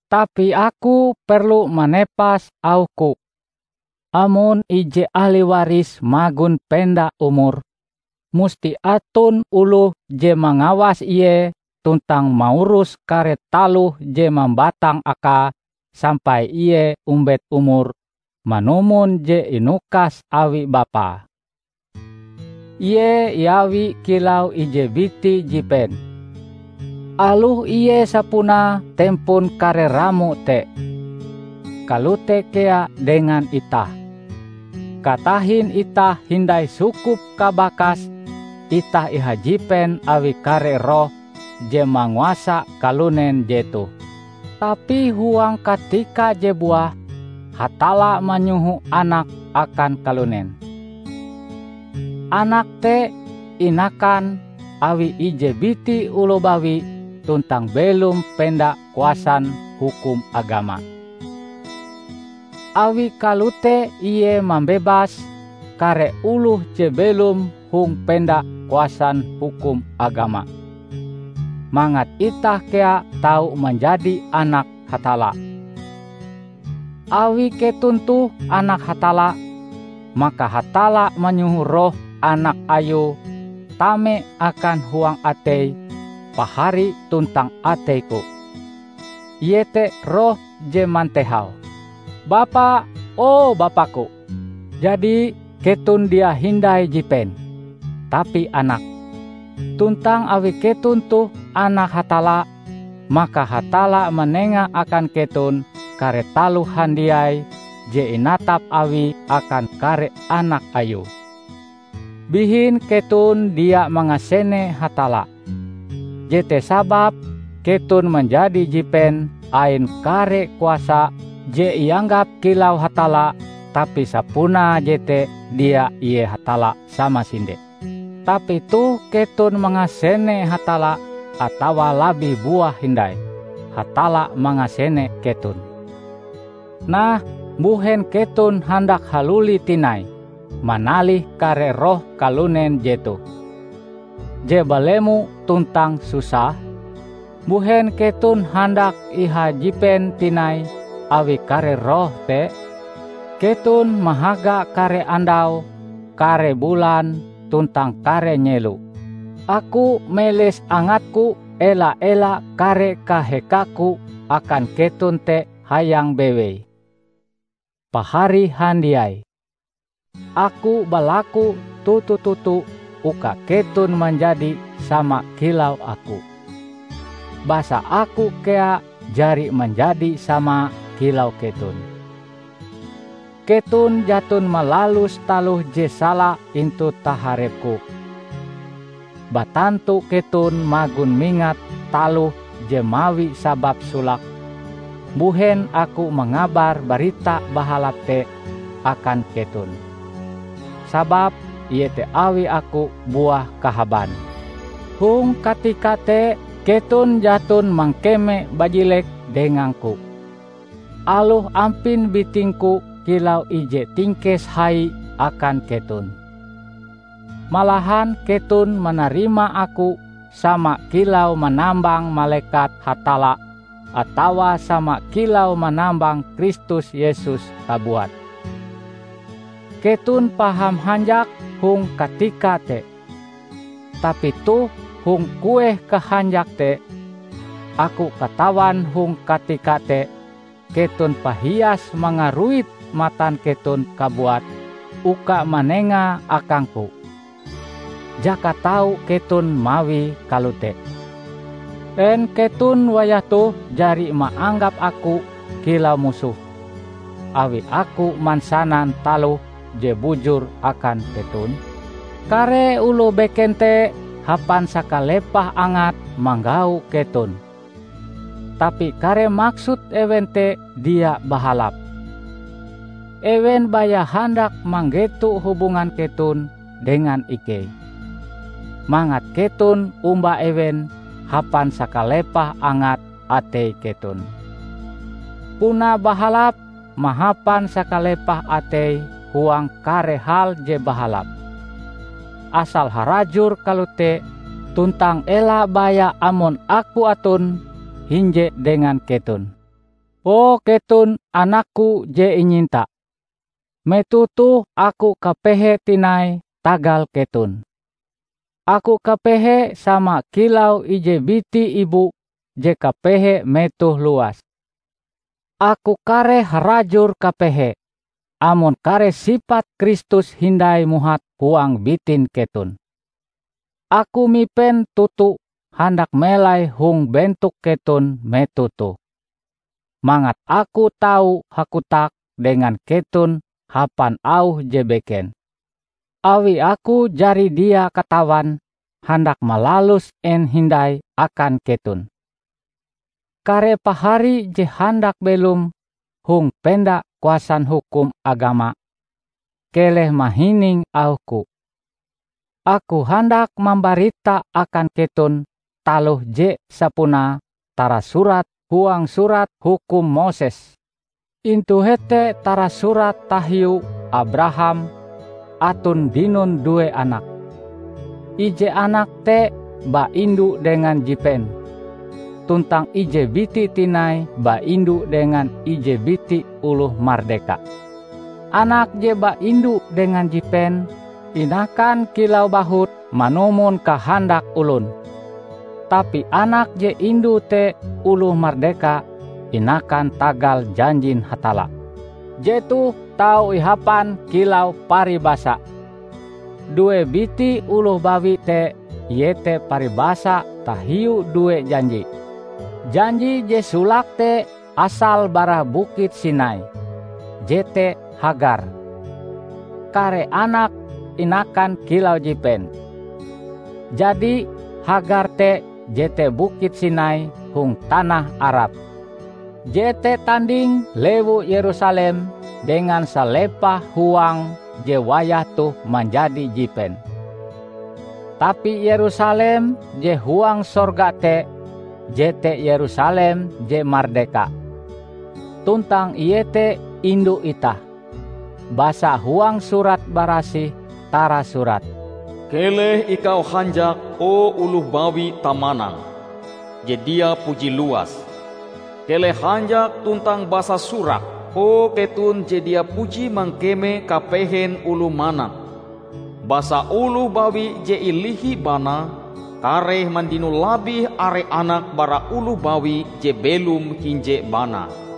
Tapi aku perlu manepas auhku: amon ije ahli waris magon penda umur, musti aton oloh je mangawas ie tuntang maurus kare taloh je mambatang akae sampai ie ombet umure manumon je inukas awi bapae. Ie iawi kilau ije biti jipen, aloh ie sapunae tempon kare ramo te. Kalote kea dengan itah: katahin itah hindai sukup kabakas, itah ihajipen awi kare roh je manguasa kalunen jetoh. Tapi huang katika je buah, Hatalla manyoho Anake akan kalunen. Anake te inakan awi ije biti oloh bawi tuntang belom penda kuasan hukum agama. Awi kalote Ie mambebas kare oloh je belom hong penda kuasan hukum agama; mangat itah kea tau manjadi anak Hatalla. Awi keton toh anak Hatalla, maka Hatalla manyoho Roh Anak Ayue tame akan huang atei pahari tuntang ateiku, iete Roh je mantehau, "Bapa, o Bapaku." Jadi, keton dia hindai jipen, tapi anak. Tuntang awi keton toh anak Hatalla, maka Hatalla manenga akan keton kare taloh handiai je inatap Awie akan kare anak Ayue. Bihin keton dia mangasene Hatalla, jete sababe keton manjadi jipen ain kare kuasa je ianggap kilau hatalla tapi sapunae jete dia ie Hatalla samasinde. Tapi toh keton mangasene Hatalla, atawa labih buah hindai, Hatalla mangasene keton. Nah, mbuhen keton handak haluli tinai manalih kare roh kalunen jetoh, je balemo tuntang susah? Mbuhen keton handak ihajipen tinai awi kare roh te? Keton mahaga kare andau, kare bulan, tuntang kare nyelo. Aku meles angatku ela-ela kare kahekaku akan keton te hayang bewei. Pahari handiai! Aku balaku toto-toto uka keton manjadi sama kilau aku. Basa aku kea jari manjadi sama kilau keton. Keton jaton malalus taloh je sala intu taharepku. Batantu keton magon mingat taloh je mawi sabab solake mbuhen aku mangabar Barita Bahalap te akan keton. Sababe iete awi aku buah kahaban. Hong katika te keton jaton mangkeme bajilek dengangku, aloh ampin bitingku kilau ije tingkes hai akan keton. Malahan keton manarima aku sama kilau manambang malekat Hatalla atawa sama kilau manambang Kristus Yesus kabuat. Keton paham hanjak hong katika te. Tapi toh, hong kueh kahanjak te? Aku katawan hong katika te keton pahias mangaruit matan keton kabuat uka manengae akangku, jaka tau keton mawie kalote. En keton wayah toh jari maanggap aku kilau musoh, awi aku mansanan taloh je bujur akan keton? Kare oloh beken te hapan sakalepah angate manggau keton, tapi kare maksud ewen te dia bahalap. Ewen baya handak manggeto hubungan keton dengan ikei, mangat keton omba ewen hapan sakalepah angat atei keton. Puna bahalap mahapan sakalepah atei huang kare hal je bahalap, asal harajur kalote tuntang ela baya amon aku aton hinje dengan keton. O keton, anakku je inyinta! Metoh toh aku kapehe tinai tagal keton. Aku kapehe sama kilau ije biti ibu je kapehe metoh luas. Aku kareh harajur kapehe, amon kare sipat Kristus hindai muhat huang bitin keton! Aku mipen toto handak melai hong bentok keton metoh toh, mangat aku tau hakotak dengan keton hapan auh je beken, awi aku jari dia katawan handak malalus en hindai akan keton! Kare pahari je handak belom hong penda kuasan hukum agama, keleh mahining auhku! Aku handak mambarita akan keton taloh je sapunae tarasurat huang Surat Hukum Moses. Intu hete tarasurat tahiu Abraham aton dinon due anak: ije anake te baindu dengan jipen, tuntang ije biti tinai baindu dengan ije biti oloh mardeka. Anak je baindu dengan jipen, inakan kilau bahut manumon kahandak olon. Tapi anak je indue te oloh mardeka, inakan tagal janjin Hatalla. Jetoh tau ihapan kilau paribasa. Due biti oloh bawi te iete paribasa tahiu due janji: janji je solake te asale bara Bukit Sinai -- jete Hagar; kare anake inakan kilau jipen. Jadi, Hagar te jete Bukit Sinai hong tanah Arab. Jete tanding lewu Yerusalem dengan salepah huange je wayah toh manjadi jipen. Tapi Yerusalem je huang sorga te jete Yerusalem je mardeka, tuntang ie te indu itah. Basa huang Surat Barasih tarasurat, "Keleh ikau hanjak o oloh bawi tamanang, je dia puji luas! keleh hanjak tuntang basasurak o keton je dia puji mangkeme kapehen oloh manak! Basa oloh bawi je ilihi banae kareh mandino labih are anak bara oloh bawi je belom hinje banae."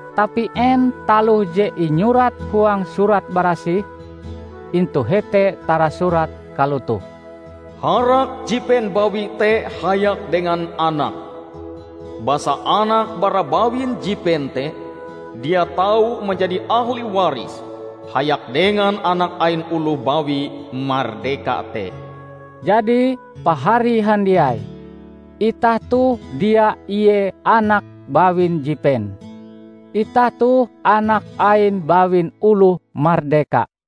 Tapi en taloh je inyurat huang Surat Barasih? Intu hete tarasurat kalotoh: "Harak jipen bawi te hayak dengan anake, basa anak bara bawin jipen te dia tau manjadi ahli waris hayak dengan anak ain oloh bawi mardeka te." Jadi, Pahari handiai, itah toh dia ie anak bawin jipen; itah toh anak ain bawin oloh mardeka.